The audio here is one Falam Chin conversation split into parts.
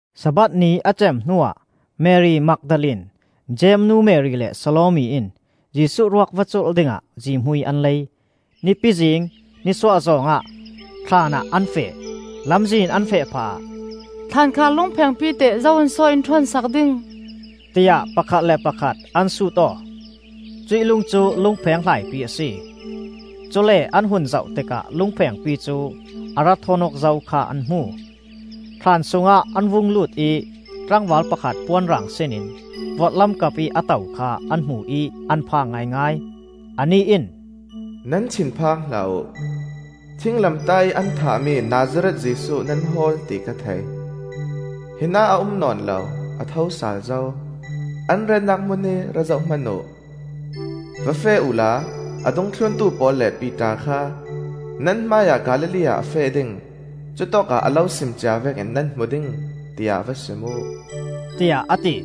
Sabbath ni a cem hnuah Mari Magdalene, Jeim nu Mari le Salome in Jesuh ruak va culh dingah zihmui an lei. Nipi zing, nisuak zawng ah thlaan ah an va feh. Lamzin an feh phah ah, “Thlankhar lungphengpi teh zo in so in ṭhawn sak ding?” tiah pakhat le pakhat an sut aw. Cuih lung cu lungpheng hlaipi a si. Cule an hun zoh tikah lungphengpi cu a rak ṭhawn aw zo kha an hmu. Thlan sungah an vung lut ih tlangval pakhat puan rang sin in vorhlam kapih a to kha an hmu ih an phang ngaingai. Anih in, “Nan thin phang hlah uh! Thinglamtah ih an thahmi Nazareth Jesuh nan hawl ti ka thei. Hinah a um nawn lo, a thosal zo. An retnak hmun hi ra zoh hman uh. Va feh uhla a dungthluntu pawl le Piter kha ‘Nan hmaiah Galilee ah a feh ding. Cutawkah a lo sim cia vekin nan hmu ding,’ tiah va sim uh,” tiah a ti.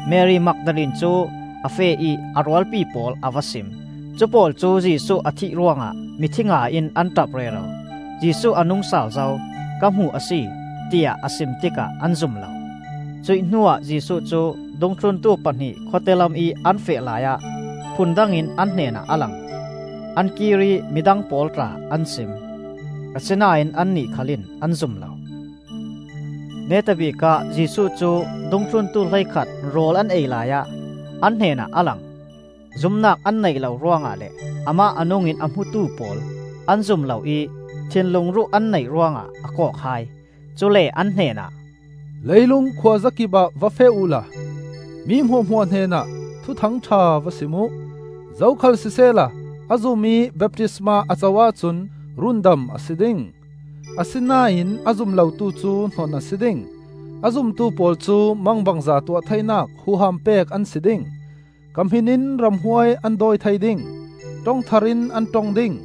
Mari Magdalene cu a feh ih a rualpi pawl a va sim. Cupawl cu Jesuh a thih ruangah mithi ngai in an ṭap rero. “Jesuh a nungsal zo, ka hmu a si!” tiah a sim tikah an zum lo. Cuih hnuah Jesuh cu dungthluntu pahnih khawte lamih an feh laiah phun dangin an hnenah a lang. An kir ih midang pawl tla an sim, asinain annih khal in an zum lo. Neta bikah Jesuh cu dungthluntu hleikhat rawl an ei laiah an hnenah a lang. Zumnak an neih lo ruangah le amah a nungin a hmutu pawl an zum lo ih thinlung ruh an neih ruangah a kawk hai. Cule an hnenah, “Leilung khuazakip ah va feh uhla mi hmuahhmuah hnenah Thuthang ṭha va sim uh. Zokhal sisehla a zum ih baptisma a co ahcun rundam a si ding. Asinain a zum lotu cu hnon a si ding. A zumtu pawl cu mangbangza tuah theinak huham pek an si ding; ka hmin in ramhuai an dawi thei ding; ṭong thar in an ṭong ding;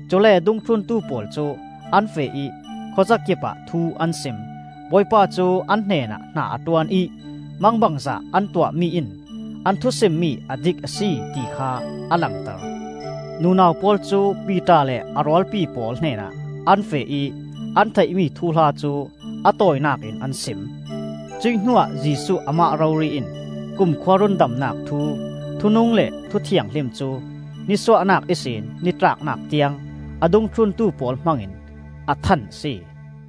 Cule dungthluntu pawl cu an feh ih khuazakip ah thu an sim; Bawipa cu an hnenah hna a ṭuan ih mangbangza an tuahmi in an thusim mi a dik a si, ti kha a langter.] MARKA THUTHANGṬHA NETNAK TAWI [9Nunau pawl cu Piter le a rualpi pawl hnenah an feh ih an theihmi thuhla cu a tawinak in an sim. 10Cuih hnuah Jesuh amah rori in kumkhua rundamnak thu, thu nung le thu thianghlim cu nisuahnak ihsin nitlaknak tiang a dungthluntu pawl hmangin a than a si.]